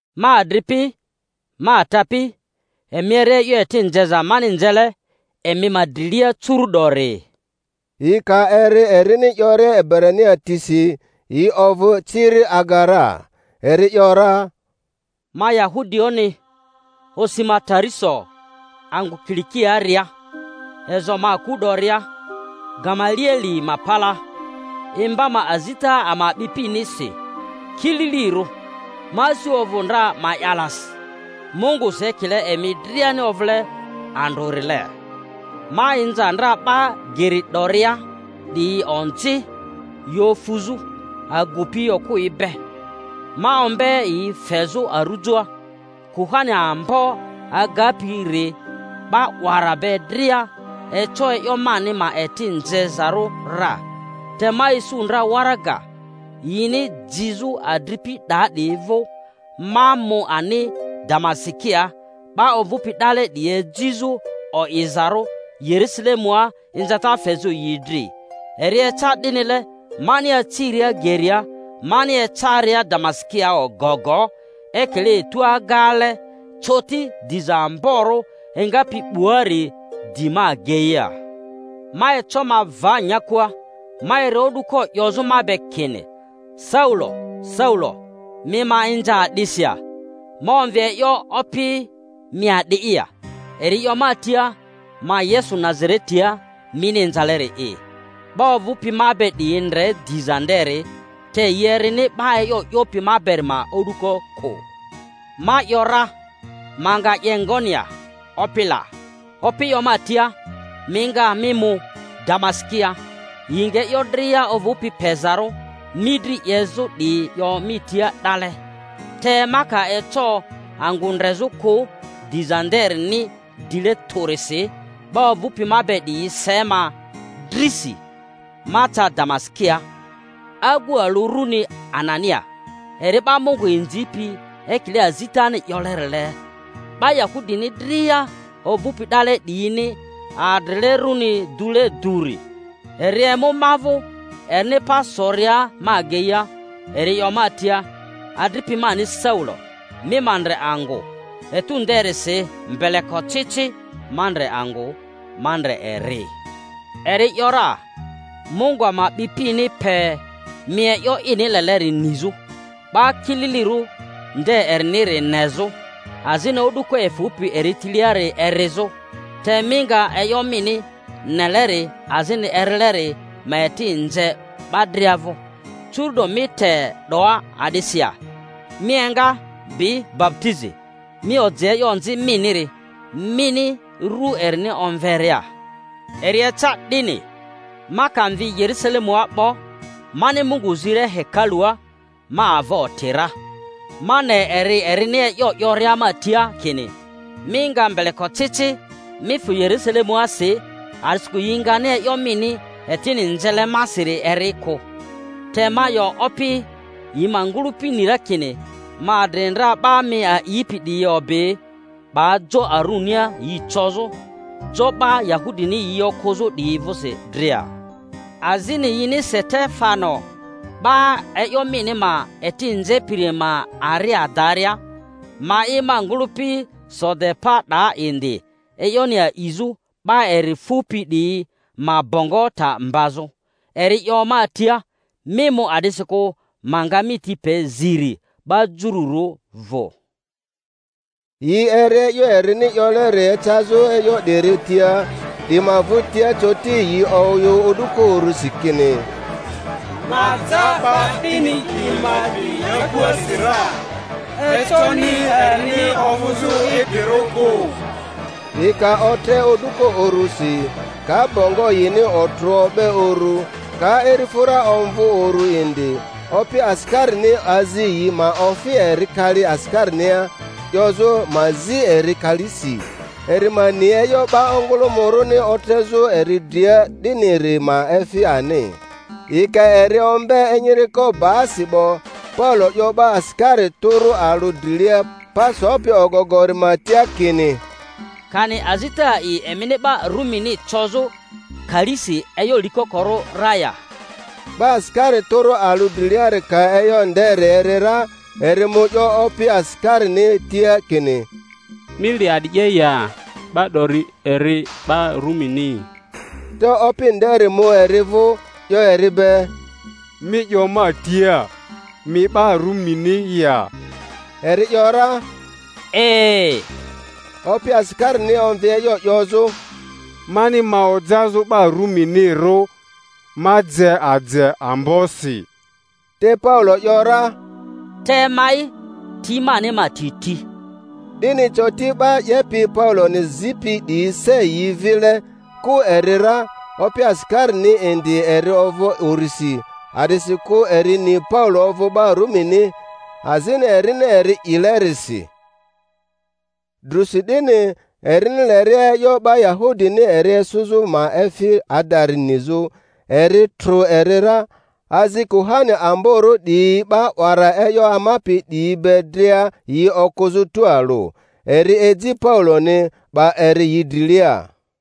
Ma adripi, ma atapi, emi eri e'yo eti nzeza mani nzele emi ma drilia curu'dori. Yi ka eri erini 'yoria Ebrania tisi, yi ovᴜ ciri aga ra. Eri 'yo ra: Ma Yahudioᴜni, osi ma Tariso angᴜ Kilikiaaria, ezo ma aku 'doria Gamalieli ma palaa, imba ma azita ama a'bipinisi kililirᴜ, ma asi ovᴜ ndra ma'yalasi Mungusi ekile emi driani ovᴜle andrᴜrile. Ma inza ndra 'ba Geri 'doria 'diyi onzi yi ofuzᴜ, agupi okᴜyi be, ma ombe yi fezᴜ arujoa; kuhani ambo agapi-ri 'ba 'wara be dria eco e'yo mani ma eti nzezarᴜ ra. Te ma isu ndra waraga yini jizᴜ adripi 'daa 'diyi vᴜ, ma mu ani Damasikia 'ba ovᴜpi 'dale 'diyi ejizᴜ o'izarᴜ Yerusalemua inzata fezᴜ yi dri. Eri eca 'dinile, mani aciria geria mani ecaria Damasikia ogogo, ekile etu agaale, coti diza amborᴜ engapi 'buari di ma ageia. Ma eco ma va nyakua, ma eri o'duko 'yozᴜ ma be kini, Saulo, Saulo, mi ma inza a'disi ya? Ma omvi e'yo, Opi, mi a'di'i ya? Eri 'yo ma tia, Ma Yesu Nazaretia mini inzaleri'i. 'Ba ovᴜpi ma be 'diyi ndre diza nderi, te yi erini 'ba e'yo 'yopi ma beri ma o'duko kᴜ. Ma ‘yora, Ma nga 'ye ngoni ya, Opi la? Opi 'yo ma tia, Mi nga, mi mu Damasikia, yi nga e'yo dria ovᴜpi pezarᴜ mi dri 'yezᴜ 'diyi 'yo mi tia 'dale. Te ma ka eco angᴜ ndrezᴜ kᴜ diza nderini dile tᴜrisi, 'ba ovᴜpi ma be 'diyi yi se ma drisi, ma ca Damasikia. Agu alᴜ runi Anania, eri 'ba Mungu inzipi ekile azitani 'yolerile, 'ba Yahudini dria ovᴜpi 'dale 'diyini adrile runi dule duri, eri emu ma vᴜ, erini pa soria ma ageia eri 'yo ma tia, Adripi mani Saulo, mi ma ndre angᴜ. Etu nderisi mbelekocici ma ndre angᴜ, ma ndre eri. Eri ‘yora, Mungu ama a'bipini pe mi e'yo ini leleri nizᴜ, 'Ba Kililirᴜ nde eriniri nezᴜ, azini o'duko efᴜpi eri tiliari erizᴜ; te mi nga e'yo mini neleri azini erileri ma eti:nze 'ba dria vᴜ. Curu'do mi te 'doa a'disi ya? Mi enga, bi baputizi, mi oji e'yo onzi miniri, mini rᴜ erini omveria. Eri eca 'dini, ma ka mvi Yerusalemua 'bo, mani Mungu ziria hekalua, ma ava oti ra, ma ne eri erini e'yo 'yoria ma tia kini, Mi nga mbelekocici, mi fᴜ Yerusale-muasi, a'disikᴜ yi ngani e'yo mini etini nzele masiri eri kᴜ. Te ma 'yo, Opi, yi ma ngᴜlᴜpi ni ra kini ma adri ndra 'ba mi a'ipi 'diyi obi 'ba jo arunia yi cozᴜ, jo 'ba Yahudini yi okᴜzᴜ 'diyi vᴜsi dria. Azini yini Setefano 'ba e'yo mini ma eti nzepiri ma ari adaria, ma'i ma ngᴜlᴜpi so de pa 'daa indi e'yoni a'izᴜ, 'ba eri fupi 'diyi ma bongo ta mbazᴜ. Eri 'yo ma tia, Mi mu, a'disikᴜ ma nga mi ti pe ziri 'ba Jururᴜ vᴜ. Yi eri e'yo erini 'yoleri ecazᴜ e'yo 'diri tia; 'di ma vᴜtia coti yi oyᴜ o'duko urusi kini, Ma ja 'ba 'dini 'di ma dri nyakuasi ra! Econi erini ovᴜzᴜ idrirᴜ kᴜ! Yi ka otre o'duko urusi, ka bongo yini otrᴜ o'be uru, ka irifᴜra omvᴜ uru indi, opi asikarini azi yi ma ofi eri kali asikarinia, 'yozᴜ ma zi eri kalisi, eri ma ni e'yo 'ba ongᴜlᴜmᴜ-rᴜni otrezᴜ eri dria 'diniri ma efi ani. Yi ka eri ombe enyiriko baasi 'bo, Paulo 'yo 'ba asikari tᴜrᴜ alᴜ drilia pa sopi ogogori ma tia kini, Kani azita a'i emini 'ba Rumini cozᴜ kalisi e'yo likokorᴜ ra ya? 'Ba asikari tᴜrᴜ alᴜ driliari ka e'yo nderi eri ra, eri mu 'yo opi asikarini tia kini, Mi le a'di 'ye ya? 'Ba 'dori eri 'ba Rumini. Te opi nderi mu eri vᴜ, 'yo eri be, Mi 'yo ma tia, mi 'ba Rumini ya? Eri ‘yora, E. Opi asikarini omvi e'yo 'yozᴜ, Mani ma ojazᴜ 'ba Ruminirᴜ, ma je aje ambosi. Te Paulo ‘yora, Te ma'i, ti mani ma ti ti. 'Dini coti 'ba 'yepi Pauloni zipi 'diyi se yi vile, kᴜ eri ra; opi asikarini indi eri ovᴜ urisi, a'disikᴜ eri ni Paulo ovᴜ 'ba Rumini, azini erini eri 'ilerisi. Drusi 'dini, erini leria e'yo 'ba Yahudini eri esᴜzᴜ ma efi adari nizᴜ, eri trᴜ eri ra, azi kuhani amborᴜ 'diyi 'ba 'wara e'yo amapi 'diyi be dria yi okᴜzᴜ tualᴜ. Eri eji Pauloni, 'ba eri yi drilia.